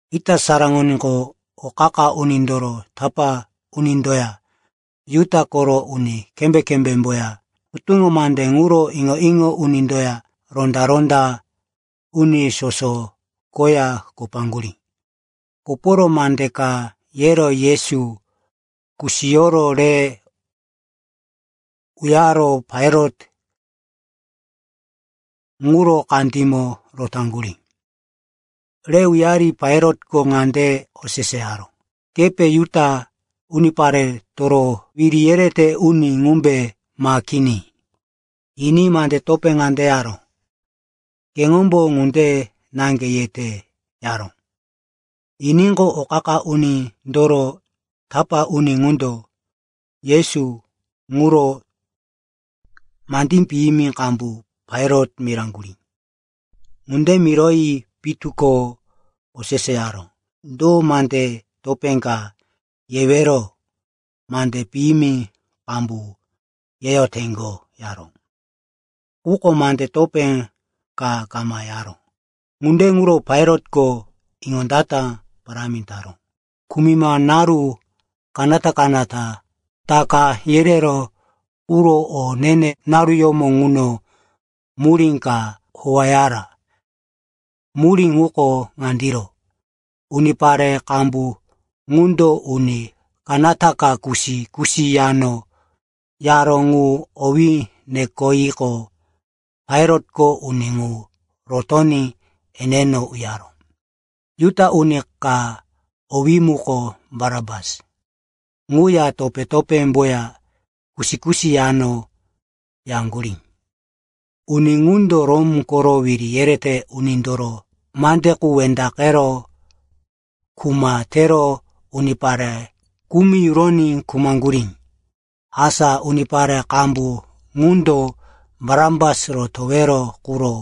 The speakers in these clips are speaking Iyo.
Ita saraŋoníqo, o qa-qa unindoro tapá unindoya Juda koro uni kembé-kembémboya hutuŋo mande ŋuro iŋo-iŋo unindoya ronda-ronda uni soso koya kopaŋgurí. Koporo mande ka yero Yesu kusiyoro re uyaro Pailat ŋuro kandímo rotaŋgurí. Re uyari Pailatko ŋande oseseyaró, “Kepe Juda uniparetoro wiri yerete uni ŋumbe, ma kini?” Yiní mande topé ŋande yaró, “Keŋombo ŋunde naŋge yete,” yaró. Yiníqo, o qa-qa unindoro tapá uni ŋundo Yesu ŋuro mande piyimi qambu Pailat miraŋgurí. Ŋunde miroyi pitu ko oseseyaró, “Do mande topé ka yewero? Mande piyimi qambu yeyoteŋgo,” yaró. Quko mande topé ka kama yaró. Ŋunde ŋuro Pailat iŋondata parámi taró. Kumima naru kanata-kanata Taka yereró quro o ne-ne naruyómo ŋuno, murí ka howeyara. Murí ŋuko ŋandiro, unipare qambu ŋundo uni kanata ka kusi-kusi yano yaró ŋu owí nekoyiqo, Pailatko uni ŋu rotoní eneno uyaró. Juda uni ka, owí muko Barapas, ŋuya topé-topémboya kusi-kusi yano yaŋgurí. Uni ŋundo Rom koro wiri yerete unindoro mande qu wendaqero, kuma tero, unipare kumi yuroyi khumaŋgurí. Asa unipare qambu ŋundo Barapas rotowero quro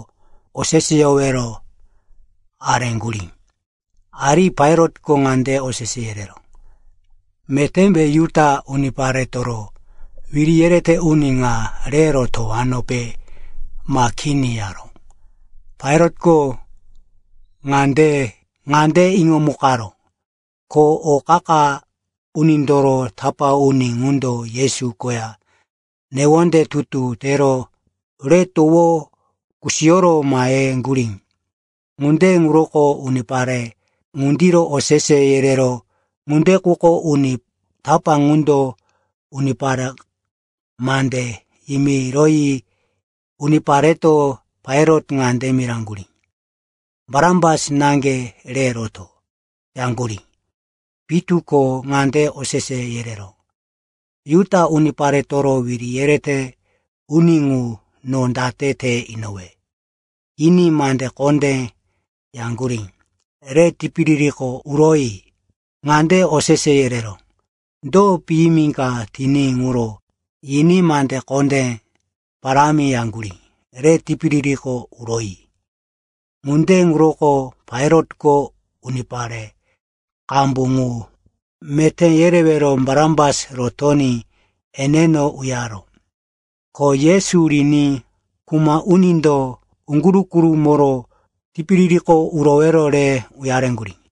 oseseyowero areŋgurí. Ari Pailatko ŋande osese yereró, “Metémbe Juda uniparetoro wiri yerete uni ŋa re rotowanope ma kini?” yaró. Pailatko ŋande iŋomukaró, ko o qa-qa unindoro tapá uni ŋundo Yesu koya newonde tutu tero re towo kusiyoro maheŋgurí. Ŋunde ŋuroko unipare ŋundiro osese yereró. Ŋunde quko uni tapá ŋundo unipare mande yimiroyi unipareto Pailat ŋande miraŋgurí, “Barapas naŋge re roto,” yaŋgurí. Pitu ko ŋande osese yereró, “Juda uniparetoro wiri yerete uni ŋu, no date te inowe?” Yiní mande kondé yaŋgurí, “Re tipiririko uroyi!” Ŋande osese yereró, “Do piyimi ka tiní ŋuro?” Yiní mande kondé parámi yaŋgurí, “Re tipiririko uroyi!” Ŋunde ŋuroko Pailatko unipare qambu ŋu meté yerewero Barapas rotoní eneno uyaró, ko Yesu riní kuma unindo uŋguru-gurumoro tipiririko urowero re uyareŋgurí.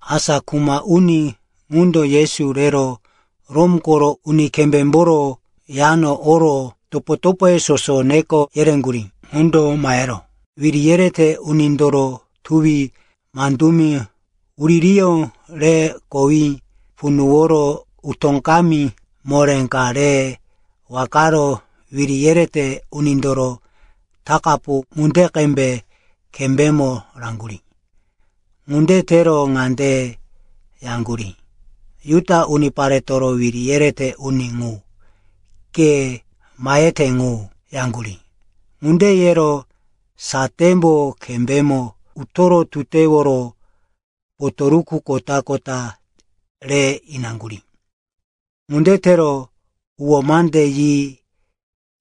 Asa kuma uni ŋundo Yesu rero Rom koro uni kembémboro yano oro topo-topoye soso neko yereŋgurí. Ŋundo mahero wiri yerete unindoro tuwi mandumi huririyó re kowí punuworo utó kami moré ka re wakaro wiri yerete unindoro takapu ŋunde qembe kembémo raŋgurí. Ŋunde tero ŋande yaŋgurí, “Juda uniparetoro wiri yerete uni ŋu, ke mahete ŋu,” yaŋgurí. Ŋunde yero satémbo kembémo utoro tuteworo potoruku kota-kota re inaŋgurí. Ŋunde tero huwó mande yi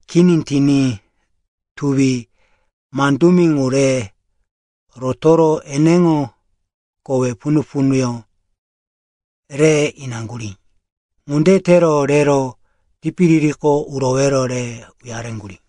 kini tiní tuwi mandumi ŋu re rotoro eneŋo kowe punu-punuyó re inaŋgurí. Ŋunde tero rero tipiririko urowero re uyareŋgurí.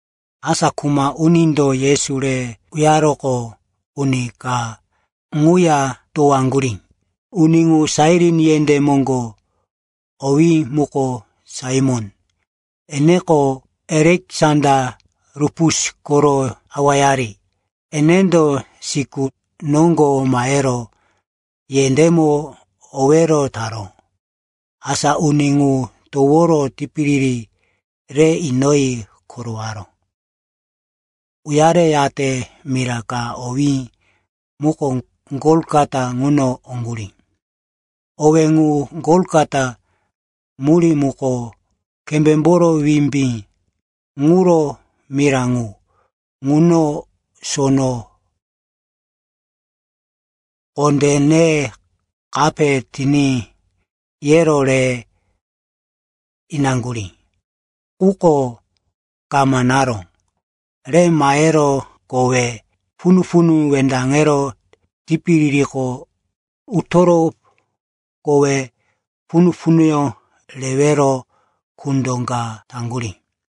Asa kuma unindo Yesu re uyaroqo, uni ka ŋuya towaŋgurí. Uni ŋu Sairin yendé moŋgo, owí muko Saimon, eneko Aleksanda, Rupus koro awayari. Enendo siku noŋgo mahero yendémo owero taró. Asa uni ŋu toworo tipiriri re inoyi korowaró. Uyareyate mira ka, owí muko Golgota, ŋuno oŋgurí. (Owé ŋu “Golgota” murí muko “Kembémboro Wimbí ŋuro mira ŋu.”) Ŋuno sono kondé ne kape tiní, yero re inaŋgurí. Quko kama naró. Re mahero kowe punu-punu wendaŋero tipiririko utoro kowe punu-punuyó rewero kundo ka taŋgurí.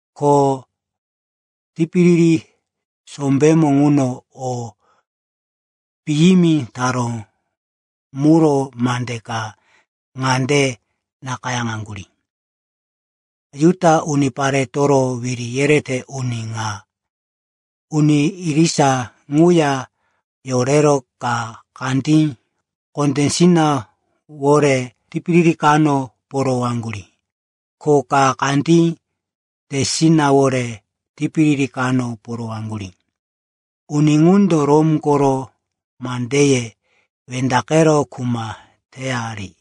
Ko tipiriri sombémo ŋuno o piyimi taró muro mande ka ŋande nakayáŋaŋgurí, “Juda Uniparetoro Wiri Yerete Uni ŋa.” Uni irisa ŋuya yorero ka kandí kondésinawore tipiriri kano porowaŋgurí, ko ka kandí tesinawore tipiriri kano porowaŋgurí. Uni ŋundo Rom koro mandeye wendaqero kuma teyari.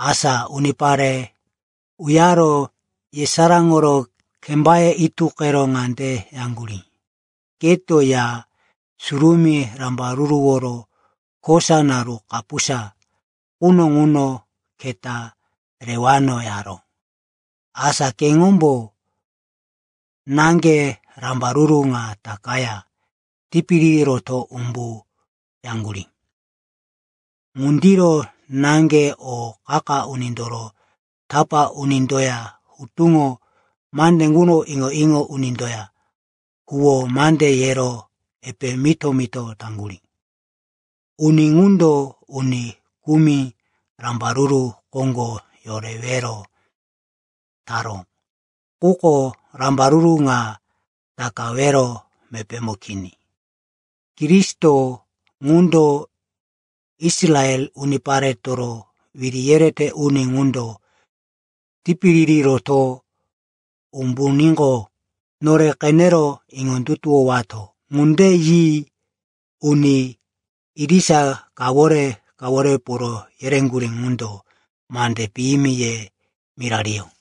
Asa unipare uyaro yesaráŋoro kembaye ituqero ŋande yaŋgurí, “Keto, Ya Surumí rambaruruworo kosa naru kapusa quno ŋuno keta rewano, yaró! Asa keŋombo naŋge rambaruru ŋa takaya tipiriri roto umbu,” yaŋgurí. Ŋundiro naŋge o qa-qa unindoro tapá unindoya hutuŋo mande ŋuro iŋo-iŋo unindoya huwó mande yero epe mito-mito taŋgurí, “Uni ŋundo uni kumi rambaruru koŋgo yorewero taró. Quko rambaruru ŋa takawero mepémo kini. Kristo ŋundo, Israel uniparetoro wiri yerete uni ŋundo, tipiriri roto umbuníqo, nore qenero iŋondutuwowato.” Ŋunde yi uni irisa kawore-kawore poro yereŋgurí ŋundo mande piyimi ye mirariyó.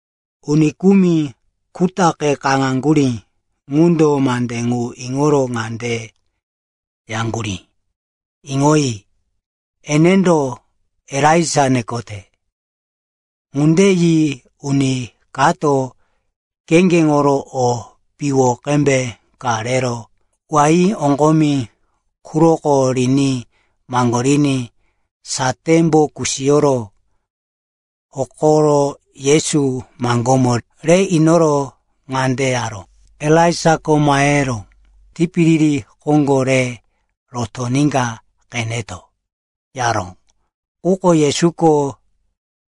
Uni kumi kutaqe kaŋaŋgurí ŋundo mande ŋu iŋoro ŋande yaŋgurí, “Iŋoyi, enendo Elaija nekote.” Ŋunde yi uni kato kheŋgeŋoro o piwo qembe ka rero wain oŋgomi quroko riní maŋgoriní satémbo kusiyoro hokoro Yesu maŋgómo re inoro ŋande yaró, “Elaijako mahe tipiriri koŋgo re rotoníka qeneto,” yaró. Quko Yesuko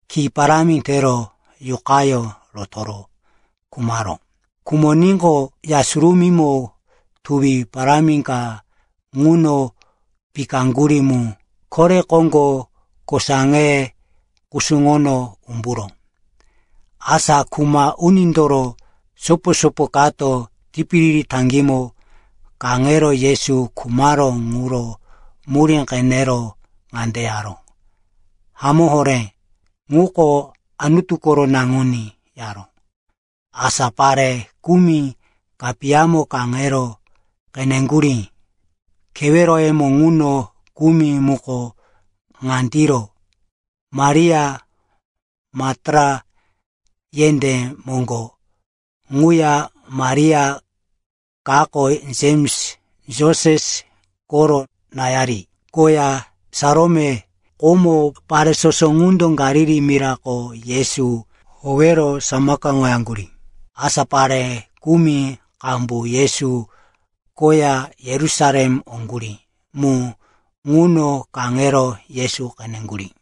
ki parámi tero yuqayó rotoro khumaró. Khumoníqo, Ya Surumímo tuwi parámi ka ŋuno pikaŋgurí mu kore koŋgo kosaŋe kusuŋono umburó. Asa kuma unindoro sopo-sopo kato tipiriri taŋgímo kaŋero Yesu khumaró ŋuro murí qenero ŋande yaró, “Hamó horé, ŋuko Anutu koro naŋuní,” yaró. Asa pare kumi kapiyamo kaŋero qeneŋgurí. Keweroyemo ŋuno kumi muko ŋandiro: Maria, Maktala yendé moŋgo quya Maria kako, Jems, Joses koro náyari, koya Salome. Komo pare soso ŋundo Galili mirako Yesu howero samakaŋoyaŋgurí. Asa pare kumi qambu Yesu koya Yerusalem oŋgurí mu ŋuno kaŋero Yesu qeneŋgurí.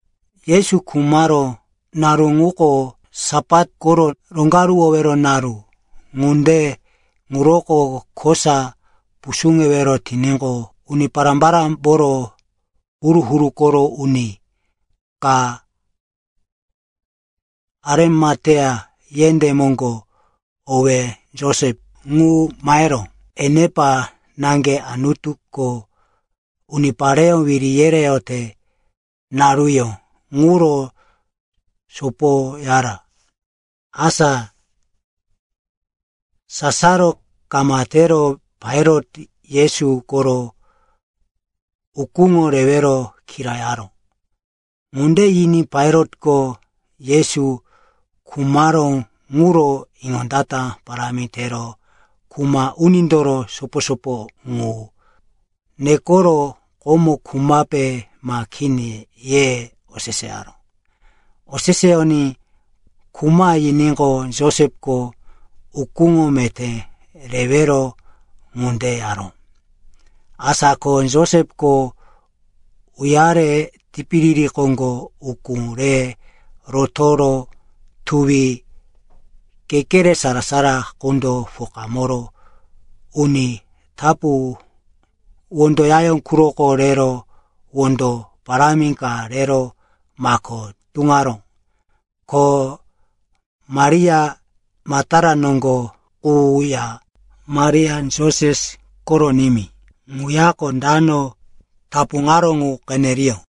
Yesu khumaró naru ŋuko Sapat koro roŋgaruwowero naru. Ŋunde ŋuroko kosa pusuŋewero tiníqo, uni pará-parámboro huru-huru koro uni ka Arimatea yendé moŋgo, owí Josep, ŋu maheró. Enepa naŋge Anutuko unipareyó wiri yereyote naruyó ŋuro sopoyara. Asa sasaro kama tero Pailat Yesu koro ukúŋo rewero kirayaró. Ŋunde yiní Pailatko Yesu khumaró ŋuro iŋondata parámi tero kuma unindoro sopo-sopo ŋu nekoro, komo khumape ma kini, ye oseseyaró. Oseseyoní, “Khuma,” yiníqo, Josepko ukúŋo meté rewero ŋunde yaró. Asa ko Josepko uyare tipiriri koŋgo ukú re rotoro tuwi kekere sara-sara qundo pokamoro uni tapu wondo yayó quroko rero wondo parámi ka rero mako tuŋaró. Ko Maria Maktala noŋgo quya Maria, Joses koro nimí ŋuyako dano tapuŋaró ŋu qeneriyó.